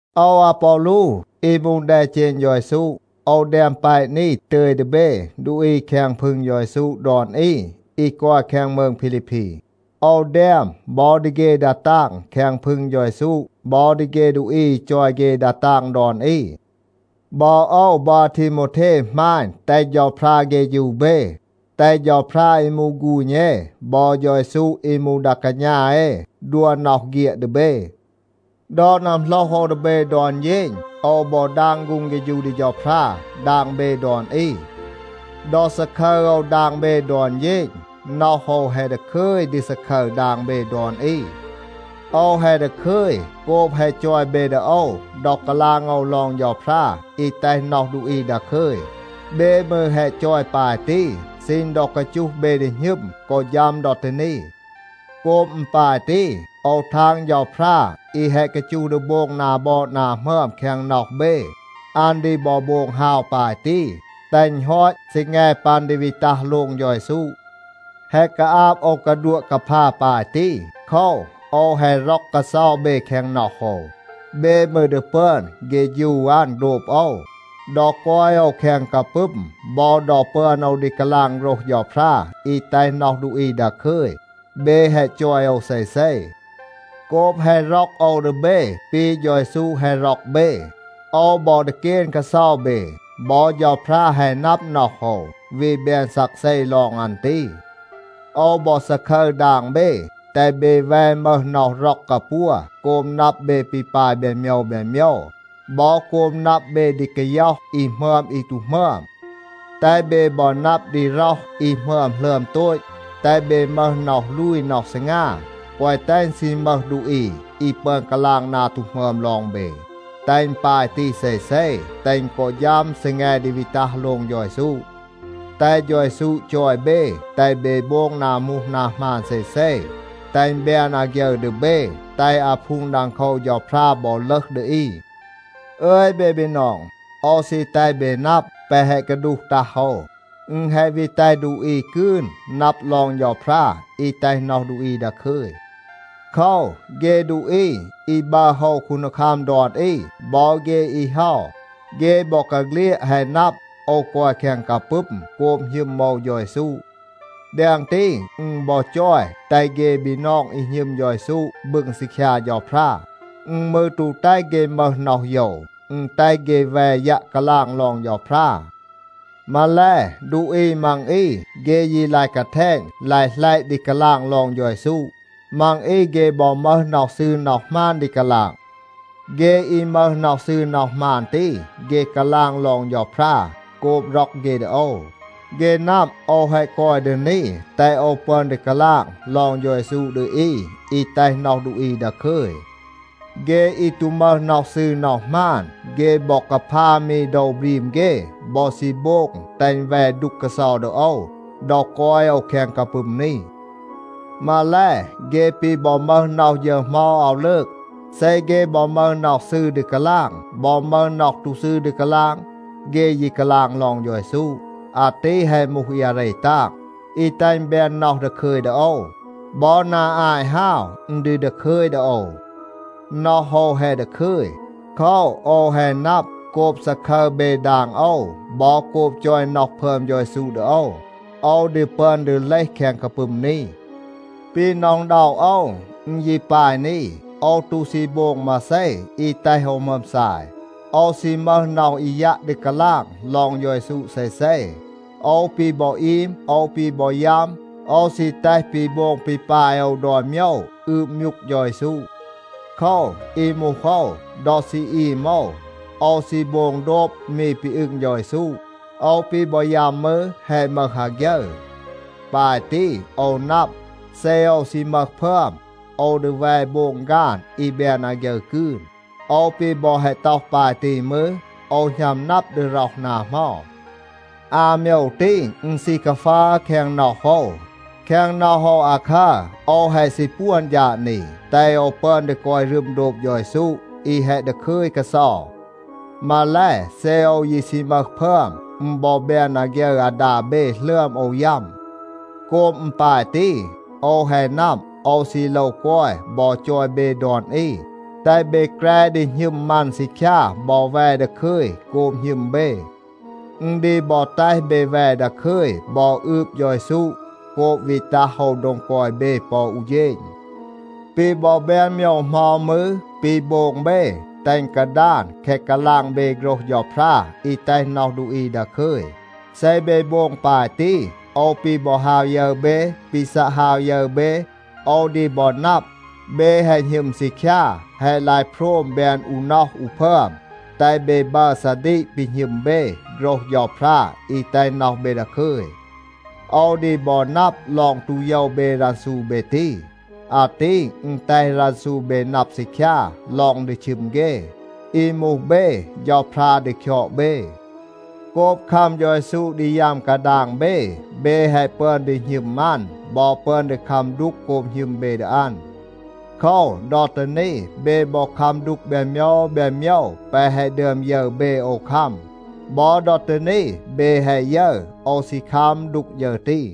โอว อาปอลู อี มูห แดเจณ เฌา เยซู, โอว แดม แปะ นี ตึย ดี เบ ดูอี แคง พึง เฌา เยซู ดอน อี อี กอย แคง มืง พีลีพี. โอว แดม บอ ดี เฆ ดา ตาง แคง พึง เฌา เยซู บอ ดี เฆ ดูอี อี จอย เฆ ดา ตาง ดอน อี. บอ โอว บอ อาทีโมวเท หมาณ, แตห เฌาพรา เฆฌู เบ. แตห เฌาพรา อี มูห ฆูณ เอ บอ เฌา เยซู อี มูห ดา กาณา เอ ดัว น็อห เฆียด ดี เบ. ดอ นัมโหลห โอว ดี เบ ดอน เฌณ, โอว บอ ดาง ฆูง เฆฌู ดี เฌาพรา ดาง เบ ดอน อี. ดอ ซาคึร โอว ดาง เบ ดอน เฌณ, น็อห โอว แฮะ ดาคึย ดี ซาคึร ดาง เบ ดอน อี. โอว แฮะ ดาคึย โกบ แฮะ จอย เบ ดี โอว ดอ กาลาง โอว ลอง เฌาพรา อี แตห น็อห ดูอี ดาคึย. เบ มืร แฮะ จอย ปาย ตี, ซีณ ดอ กาจูห เบ ดี หณึม กอ ฌัม ดอ ตี นี. โกบ อึณ ปาย ตี, โอว ทาง เฌาพรา อี แฮะ กาจูห ดี โบง นา บอด นา หมึอม แคง น็อห เบ, อัน ดี บอ โบง ฮาว ปาย ตี, แตห อึณ ฮอต ซีแง ปัน ดี วี ตัห โลง เฌา เยซู. แฮะ กาอาบ โอว กาดัวะ กาพา ปาย ตี. โคว, โอว แฮะ ร็อก กาเซา เบ แคง น็อห โอว. เบ มืร ดี ปึอน เฆฌู อัน โดบ โอว. ดอ กอย โอว แคง กาปึม บอ ดอ ปึอน โอว ดี กาลาง โฆรห เฌาพรา อี แตห น็อห ดูอี ดาคึย, เบ แฮะ จอย โอว เซเซ. โกบ แฮะ ร็อก โอว ดี เบ ปี เฌา เยซู แฮะ ร็อก เบ, โอว บอ ดีเกน กาเซา เบ. บอ เฌาพรา แฮะ นับ น็อห โอว, วี แบน ซักเซ ลอง อัน ตี. โอว บอ ซาคึร ดาง เบ, แตห เบ แว มึห น็อห ร็อก กาปัว โกบ นับ เบ ปี ปาย แบน โมยว แบน โมยว, บอ โกบ นับ เบ ดี กาย็อห อี หมึอม อี ตู หมึอม. แตห เบ บอ นับ ดี ร็อห อี หมึอม หลึอม โตต. แตห เบ มึห น็อห ลูย น็อห ซีงา, แกวะ แตห อึณ ซี มึห ดูอี อี ปึอน กาลาง นา ตู หมึอม ลอง เบ. แตห อึณ ปาย ตี เซเซ, แตห อึณ กอ ฌัม ซีแง ดี วี ตัห โลง เฌา เยซู. แตห เฌา เยซู จอย เบ, แตห เบ โบง นา มูห นา หมาน เซเซ, แตห อึณ แบน อาฆยึร ดี เบ, แตห อาพูง ดังโคว เฌาพรา บอ ลึห ดี อี. อึย เบ บีนอง, โอว ซี แตห เบ นับ แปะ แฮะ กาดูห ตัห โอว, อึณ แฮะ วี แตห ดูอี กืน นับ ลอง เฌาพรา อี แตห น็อห ดูอี ดาคึย. โคว, เฆ ดูอี อี บัร โฮว คูนดีคัม ดอน อี บอ เฆ อี เฮา, เฆ บอกาเฆลียด แฮะ นับ, โอว กอย แคง กาปึม โกบ หณึม โอว เฌา เยซู. แดง ตี, อึณ บอ จอย แตห เฆ บีนอง อี หณึม เฌา เยซู บึง ซีคยา เฌาพรา. อึณ มืร ตู แตห เฆ มึห น็อห โยว. อึณ แตห เฆ แว ยัะ กาลาง ลอง เฌาพรา. มาแล, ดูอี มัง อี เฆ ยี ลาย กาแทณ, ลาย หลัยะ ดี กาลาง ลอง เฌา เยซู. มัง อี เฆ บอ มึห น็อห ซืร น็อห หมาน ดี กาลาง. เฆ อี มึห น็อห ซืร น็อห หมาน ตี, เฆ กาลาง ลอง เฌาพรา โกบ ร็อก เฆ ดี โอว. เฆ นับ, โอว แฮะ กอย ดี นี แตห โอว ปึอน ดี กาลาง ลอง เฌา เยซู ดี อี อี แตห น็อห ดูอี ดาคึย. เฆ อี ตู มึห น็อห ซืร น็อห หมาน, เฆ บอ กาพา มี โดว บรีม เฆ บอ ซี โบง แตห อึณ แว ดูก กาเซา ดี โอว ดอ กอย โอว แคง กาปึม นี. มาแล, เฆ ปี บอ มึห น็อห ฌึร เหมา อาว ลืก. เซ เฆ บอ มึห น็อห ซืร ดี กาลาง, บอ มึห น็อห ตู ซืร ดี กาลาง, เฆ ยี กาลาง ลอง เฌา เยซู. อาตี แฮะ มูห อี อาเร ตาง, อี แตห อึณ แบน น็อห ดาคึย ดี โอว. บอ นา อาต ฮาว อึณ ดี ดาคึย ดี โอว. น็อห โอว แฮะ ดาคึย. โคว, โอว แฮะ นับ, โกบ ซาคึร เบ ดาง โอว บอ โกบ จอย น็อห พึอม เฌา เยซู ดี โอว, โอว ดี ปึอน ดี เลห แคง กาปึม นี. ปี หน็อะ อึณด็อะ โอว, อึณ ยี ปาย นี. โอว ตู ซี โบง มาเซ อี แตห โอว หมึอม ซาย. โอว ซี มึห น็อห อี ยัะ ดี กาลาง ลอง เฌา เยซู เซเซ. โอว ปี บอ อีม, โอว ปี บอ ยัม, โอว ซี แตห ปี โบง ปี ปาย โอว ดอน โมยว อืบ มยูก เฌา เยซู. โคว, อี มูห โอว, ดอ ซี อีม โอว, โอว ซี โบง โดบ มี ปี อึง เฌา เยซู. โอว ปี บอ ยัม มืร, แฮะ มึห อาฆยึร. ปาย ตี โอว นับ, เซ โอว ซี มึห พึอม, โอว ดี แว โบง ฆาน อี แบน อาฆยึร กืน. โอว ปี บอ แฮะ ต็อห ปาย ตี มืร, โอว หณัม นับ ดี ร็อห นา เหมา. อา โมยว ตี, อึณ ซี กาฟัร แคง น็อห โอว. แคง น็อห โอว อาคัร, โอว แฮะ ซี ปวน ฌาด นี, แตห โอว ปึอน ดี กอย รึม โดบ เฌา เยซู, อี แฮะ ดาคึย กาเซา. มาแล, เซ โอว ยี ซี มึห พึอม, อึณ บอ แบน อาฆยึร อาดา เบ หลึอม โอว ยัม. โกบ อึณ ปาย ตี, โอว แฮะ นับ, โอว ซี โลว กอย บอ จอย เบ ดอน อี, แตห เบ แกร ดี หณึม มัน ซีคยา บอ แว ดาคึย โกบ หณึม เบ. อึณ ดี บอ แตห เบ แว ดาคึย บอ อืบ เฌา เยซู โกบ วี ตัห โอว โดง กอย เบ ปอ อู เฌณ. ปี บอ แบน โมยว เหมา มืร, ปี โบง เบ, แตห อึณ กาดาน แคะ กาลาง เบ โฆรห เฌาพรา อี แตห น็อห ดูอี ดาคึย. เซ เบ โบง ปาย ตี, โอว ปี บอ ฮาว ยึร เบ, ปี ซัะ ฮาว ยึร เบ, โอว ดี บอ นับ, เบ แฮะ หณึม ซีคยา, แฮะ ลาย โพรม แบน อู น็อห อู พึอม, แตห เบ บัร ซาดีก ปี หณึม เบ โฆรห เฌาพรา อี แตห น็อห เบ ดาคึย. โอว ดี บอ นับ ลอง ตู โยว เบ รันซู เบ ตี. อาตี อึณ แตห รันซู เบ นับ ซีคยา ลอง ดี ชึม เฆ. อี มูห เบ, เฌาพรา ดี คยอด เบ. โกบ คัม เฌา เยซู ดี ยัม กาดาง เบ, เบ แฮะ ปึอน ดี หณึม อัน บอ ปึอน ดี คัม ดูก โกบ หณึม เบ ดี อัน. โคว, ดอ ตี นี เบ บอ คัม ดูก แบน โมยว แบน โมยว แปะ แฮะ ดึอม ยึร เบ โอว คัม. บอ ดอ ตี นี เบ แฮะ ยึร, โอว ซี คัม ดูก ฌึร ตี.